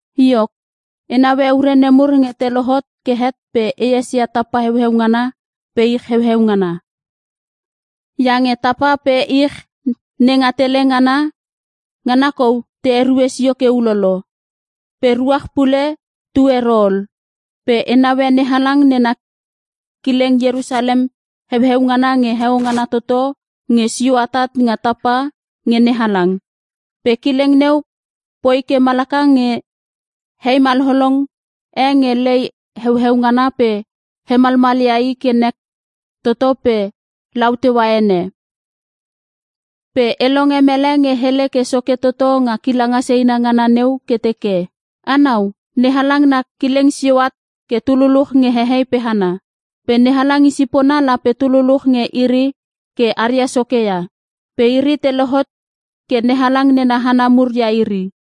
Iok, e naue ure nemur nge te lohot ke het pe e esia tapa heueu ngana pe ich heueu ngana. Iange tapa pe ich nenga tele ngana, ngana kou te erue sio ke ulolo. Pe ruach pule tu ero ol. Pe e naue NeHalang nena kileng Ierusalem heueu ngana nge Heo Ngana Toto nge sio atat nga tapa nge NeHalang. Pe kileng neu poi ke malaka nge hei malolong e nge lei heueu ngana pe hemalmalia i ke nek toto pe lataua ene. Pe e longe mele nge hele ke soke toto nga kilanga seina ngana neu ke teke, “Anau! NeHalang na kileng sio at ke tu luluch nge hehei pe hana. Pe NeHalang i sipona lape tu luluch nge iri ke aria Soke ia. Pe iri te lohot ke NeHalang nena hana mur ia iri.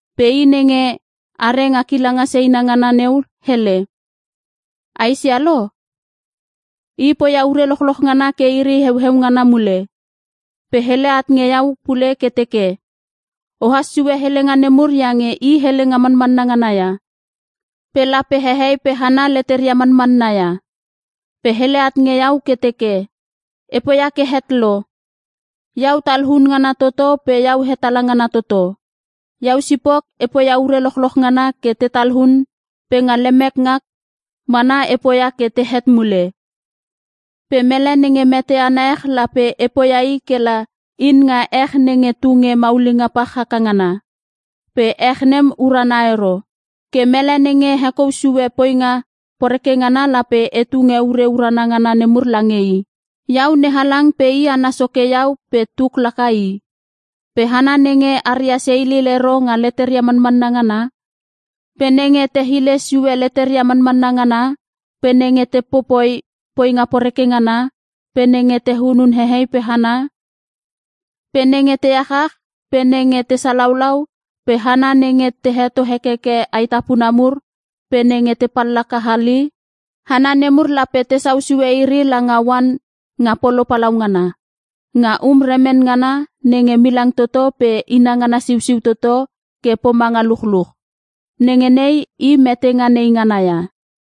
Pe I nenge are nga kilanga seina ngana neu hele, “A esia lo! E poia ure lochloch ngana ke iri heueu ngana mule.” Pe hele at nge iau pule ke teke, “O has sue helenga nemur iange i helenga manmanna ngana ia, pe lape hehei pe hana leteria manmanna ia.” Pe hele at nge iau ke teke, “E poia ke het lo! Iau Talun ngana Toto pe Iau Hetala ngana Toto. Iau sipok e poia ure lochloch ngana ke te talun, pe nga lemek ngak mana e poia ke te het mule. Pe mele nenge meteana ech lape e poia i kela in nga ech nenge tunge maulinga pach haka ngana. Pe ech nem uruna ero. Ke mele nenge hekou susue poinga poreke ngana lape e tunge ure urana ngana nemur lange i. Iau NeHalang pe i ana Soke Iau pe tuk laka i. Pe hana nenge aria seilil ero nga leteria manmanna ngana, pe nenge te hile sue leteria manmanna ngana, pe nenge te popoi poinga poreke ngana, pe nenge te hunun hehei pe hana, pe nenge te achach, pe nenge te salaulau, pe hana nenge te heto hekeke aetapuna mur, pe nenge te pallaka hali, hana nemur lape tesau sue iri langa oan nga polo palaungana. Nga um remen ngana nenge milang toto pe inangana siusiu toto ke pomanga luchluch. Nenge nei i metenga neingana ia.”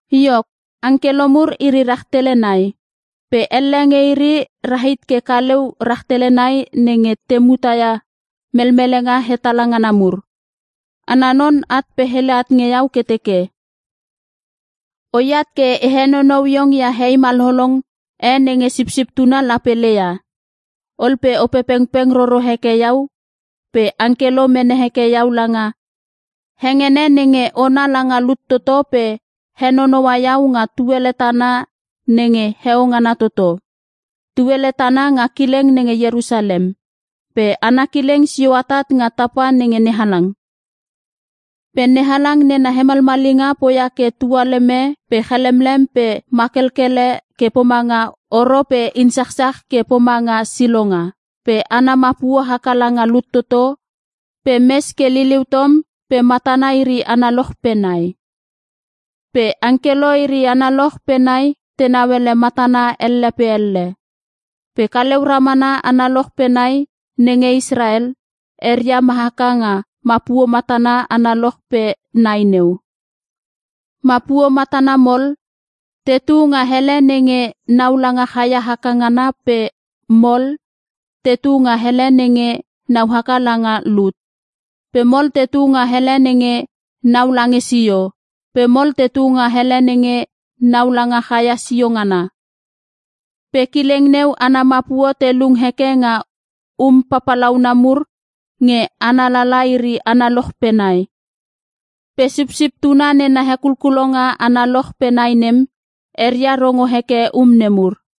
Iok, angkelo mur iri rahtele nai. Pe elle nge iri rahit ke kaliu rahtele nai nenge te mutaia melmelenga hetala ngana mur. Ana non at pe hele at nge iau ke teke, “Oiat ke e henonou iong ia hei malolong e nenge Sipsip Tuna lape leia.” Ol pe Opepengpeng roro heke iau pe angkelo mene heke iau langa hengene nenge ona langa lut toto pe henonoua iau nga Tuele tana nenge Heo Ngana toto. Tuele tana nga kileng nenge Ierusalem. Pe ana kileng sio atat nga tapa nge NeHalang. Pe NeHalang nena hemalmalinga poia ke tualeme pe chalemlem pe makelkele ke pomanga oro pe insachsach ke pomanga silonga. Pe ana mapuo haka langa lut toto pe mes ke liuliu tom pe matana iri analoch pe nai. Pe angkelo iri analoch pe nai tenau ele matana elle pe elle. Pe kaleu ramana analoch pe nai nenge Israel, eria ma haka nga mapuo matana analoch pe nai neu. Mapuo matana mol, tetu nga ele nenge nau langa chaia haka ngana pe mol, tetu nga ele nenge nau haka langa lut. Pe mol tetu nga ele nenge nau lange sio, pe mol tetu nga ele nenge nau langa chaia sio ngana. Pe kileng neu ana mapuo te lung heke nga um papalauna mur nge ana lala iri analoch pe nai. Pe Sipsip Tuna nena hekulkulonga analoch pe nai nem, eria rongo heke um nemur.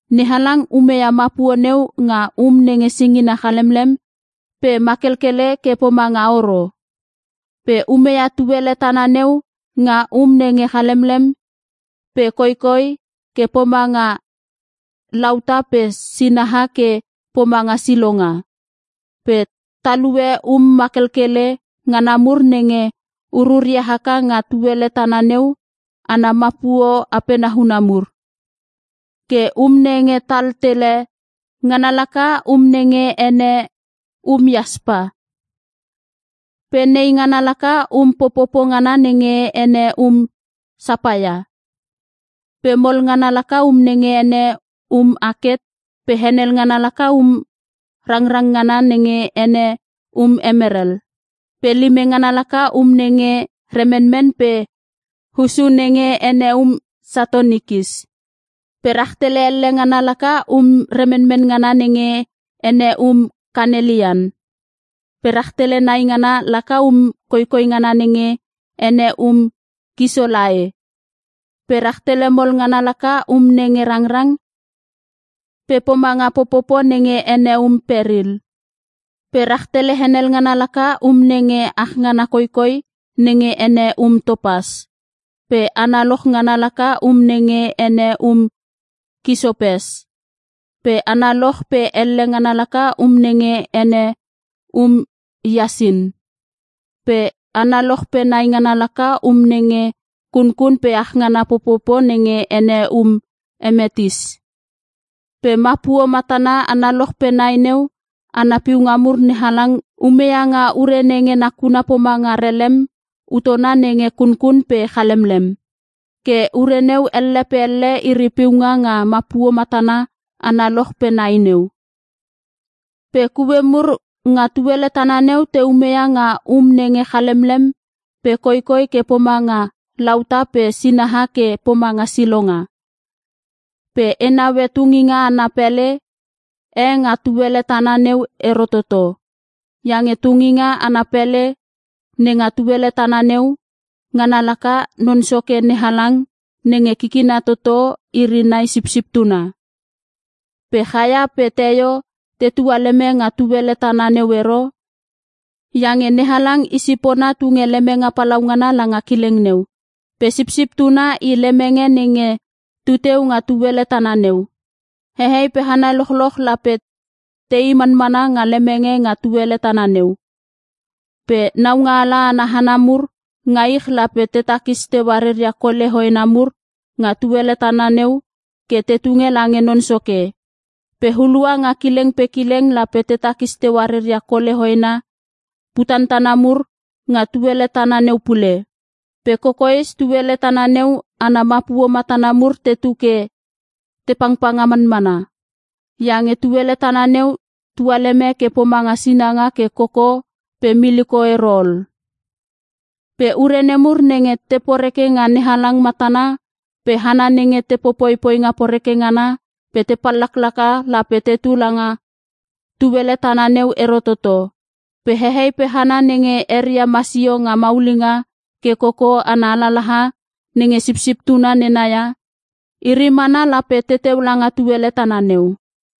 NeHalang umeia mapuo neu nga um nenge singina chalemlem pe makelkele ke pomanga oro. Pe umeia tuele tana neu nga um nenge chalemlem pe koikoi ke pomanga lauta pe sinaha ke pomanga silonga. Pe talue um makelkele ngana mur nenge ururia haka nga tuele tana neu ana mapuo apena huhuna mur. Ke um nenge tal tele, ngana laka um nenge ene um iaspa. Pe nei ngana laka um popopo ngana nenge ene um sapaia. Pe mol ngana laka um nge ene um aket pe henel ngana laka um rangrang ngana nenge ene um emerel. Pe lime ngana laka um nenge remenmen pe hussu nenge ene um satonikis. Pe rahtele elle ngana laka um remenmen ngana nenge ene um kanelian. Pe rahtele nai ngana laka um koikoi ngana nenge ene um kisolae. Pe rahtele mol ngana laka um nenge rangrang pe pomanga popopo nenge ene um peril. Pe rahtele henel ngana laka um nenge achngana koikoi nenge ene um topas. Pe analoch ngana laka um nenge ene um kisopes. Pe analoch pe elle ngana laka um nenge ene um iasin. Pe analoch pe nai ngana laka um nenge kunkun pe achngana popopo nenge ene um emetis. Pe mapuo matana analoch pe nai neu ana piunga mur NeHalang umeia nga ure nenge nakuna pomanga relem utona nenge kunkun pe chalemlem. Ke ure neu elle pe elle iri piunga nga mapuo matana analoch pe nai neu. Pe kue mur nga tuele tana neu te umeia nga um nenge chalemlem pe koikoi ke pomanga lauta pe sinaha ke pomanga silonga. Pe e naue tunginga ana pele e nga tuele tana neu ero toto. Iange tunginga ana pele nenga tuele tana neu, ngana laka Non Soke NeHalang nenge Kikina Toto iri nai Sipsip Tuna. Pe chaia pe teio te tualeme nga tuele tana neu ero, iange NeHalang i sipona tunge lemenge palaungana langa kileng neu. Pe Sipsip Tuna i lemenge nenge tuteu nga tuele tana neu. Hehei pe hana lochloch lape tei manmana nga lemenge nga tuele tana neu. Pe naungaala ana hana mur nga ich lape te takis teua reria kole hoena mur nga tuele tana neu ke te tunge lange Non Soke. Pe hulua nga kileng pe kileng lape te takis teua reria kole hoena putantana mur nga tuele tana neu pule. Pe kokoes tuele tana neu ana mapuo matana mur tetu ke te pangpanga manmana, iange tuele tana neu tualeme ke pomanga sinanga ke koko pe miliko e ero ol. Pe ure nemur nenge te poreke nga NeHalang matana pe hana nenge te popoi poinga poreke ngana pe te pallaklaka lape teteu langa tuele tana neu ero toto. Pe hehei pe hana nenge eria masio nga maulinga ke koko ana alalaha nenge Sipsip Tuna nena ia, iri mana lape teteu langa tuele tana neu.